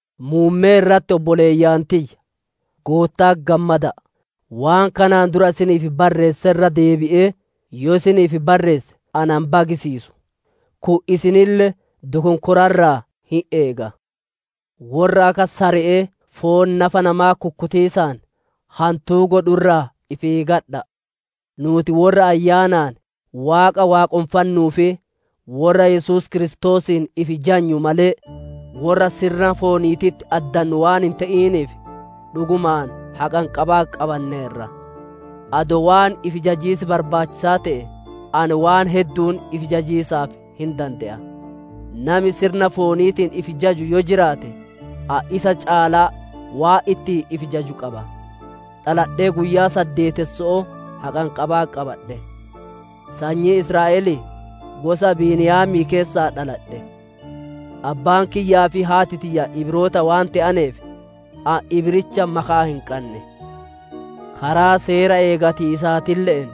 Muummee irratti, obboleeyyan tiyya! Gootta'atti gammada'a; waan kanaan dura isiniif barreesse irra deebi'ee yoo isiniif barreesse na hin bagsiisu; kun isinille dokonkora irraa hin eega. Worra akka sare'ee foon nafa namaa kukkutiisaan, hantuu godhu irraa ifi eeggadha'a! Nuuti worra Ayyaanaan Waaqa waaqonfannuu fi worra Yesuus Kiristoosiin ifi jajnu malee, worra sirna fooniititti addannu waan hin te'iniif, dhugumaan haqanqabaa qabanneerra. Adoo waan ifi jajiis barbaachisaa te'e, ani waan heddu'uun ifi jajiisaaf hin dande'a; nami sirna fooniitiin ifi jaju yoo jiraate, ani isa caalaa waan ittiin ifi jaju qaba. Dhaladhee guyyaa saddeetesso'oo haqanqabaa qabadhe; sanyii Israa'elii, gosa Beniyaamii keessaa dhaladhe. Abbaan kiyyaa fi haati tiyya Ibroota waan te'aneef ani Ibraawicha makaa hin qanne; karaa seera eegatiisaatille'een,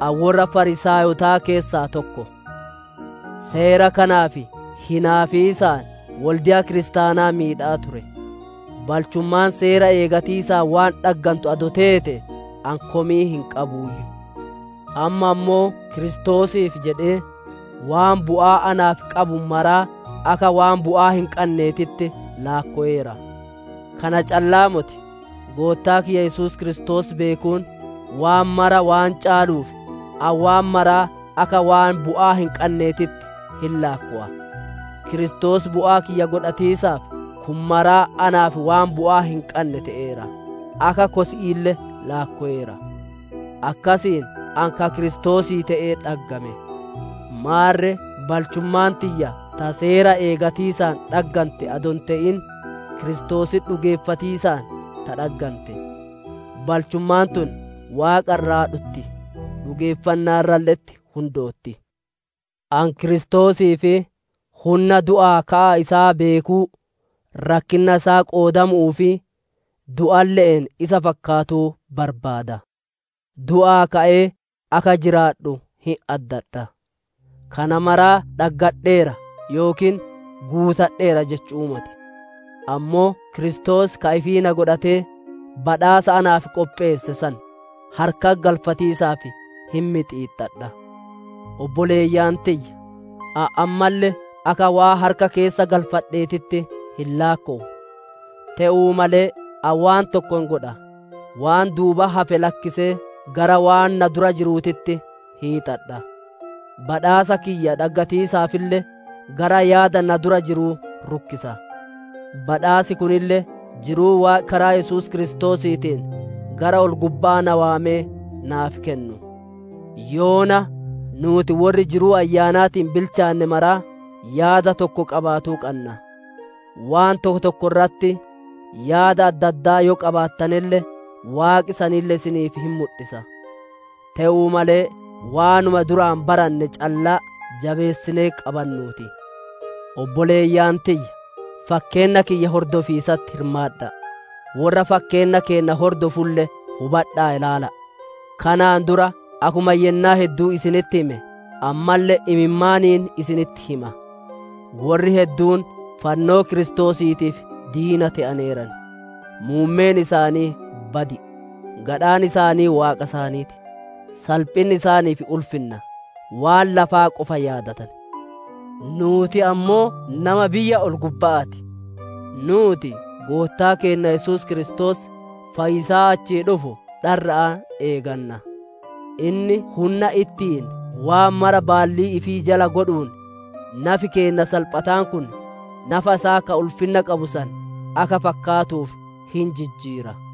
ani worra Fariisaayotaa keessaa tokko. Seera kanaaf hinaafiisaan wolde'a kiristaanaa miidhaa ture; balchummaan seera eegatiisaan waan dhaggantu adoo teetee, ani komii hin qabuuyyu. Amma ammoo Kiristoosiif jedhee, waan bu'aa naaf qabu maraa akka waan bu'aa hin qanneetitti laakkoweera. Kana calla'aa moti; Goottaa kiyya Yesuus Kiristoos beekuun, waan mara waan caaluuf, ani waan maraa akka waan bu'aa hin qanneetitti hin laakkowa; Kiristoos bu'aa kiyya godhatiisaaf kun maraa naaf waan bu'aa hin qanne te'eera; akka kosi'iille laakkoweera. Akkisiin ani ka Kiristoosii te'ee dhaggame. Maarre balchummaan tiyya ta seera eeggatiisaan dhaggante adoo hin te'in, Kiristoositti dhugeeffatiisaan ta dhaggante; balchummaan tun Waaqa irraa dhutti; dhugeeffannaa irralle'etti hundootti. Ani Kiristoosii fi hunna du'aa ka'a isaa beekuu, rakkinna isaa qoodamu'uu fi du'alle'een isa fakkaatuu barbaada. Du'aa ka'ee akka jiraadhu hin addadha. Kana maraa dhaggadheera yookiin guutadheera jechu'uu moti; ammoo Kiristoos ka ifii na godhatee badhaasa naaf qopheesse san harkatti galfatiisaaf hin mixiixxadha. Obboleeyyan tiyya! Ani ammalle akka waan harka keessa galfadheetitti hin laakkowu. Te'uu malee ani waan tokko hin godha; waan duubatti hafe lakkisee, gara waan na dura jiruutitti hiixadha. Badhaasa kiyya dhaggatiisaafille gara yaada na dura jiruu rukkisa; badhaasi kunille jiruu Waaqi karaa Yesuus Kiristoosiitiin gara ol-gubba'aa na waamee naaf kennu. Yoona nuuti worri jiruu ayyaanaatiin bilchaanne maraa yaada tokko qabaatuu qanna; waan tokko tokko irratti yaada adda addaa yoo qabaattanelle, Waaqi sanille isiniif hin mudhisa. Te'uu malee waanuma duraan baranne callaa jabeessinee qabannuu ti. Obboleeyyan tiyya! Fakkeenna kiyya hordofiisatti hirmaadha'a! Worra fakkeenna keenna hordofulle hubadha'aa ilaala'a! Kanaan dura akkuma yennaa hedduu isinitti hime, ammalle imimmaaniin isinitti hima; worri hedduun fannoo Kiristoosiitiif diina te'aneeran. Muummeen isaanii badi'i; gadhaan isaanii waaqa isaanii ti; salphinni isaaniif ulfinna; waan lafaa qofa yaadatan. Nuuti ammoo nama biyya ol-gubba'aa ti; nuuti Goottaa keenna Yesuus Kiristoos, Fayyisaa achii dhufu dharra'aan eeganna. Inni hunna ittiin waan mara baallii ifii jala godhuun, nafi keenna salphataan kun, nafa isaa ka ulfinna qabu san akka fakkaatuuf hin jijjiira.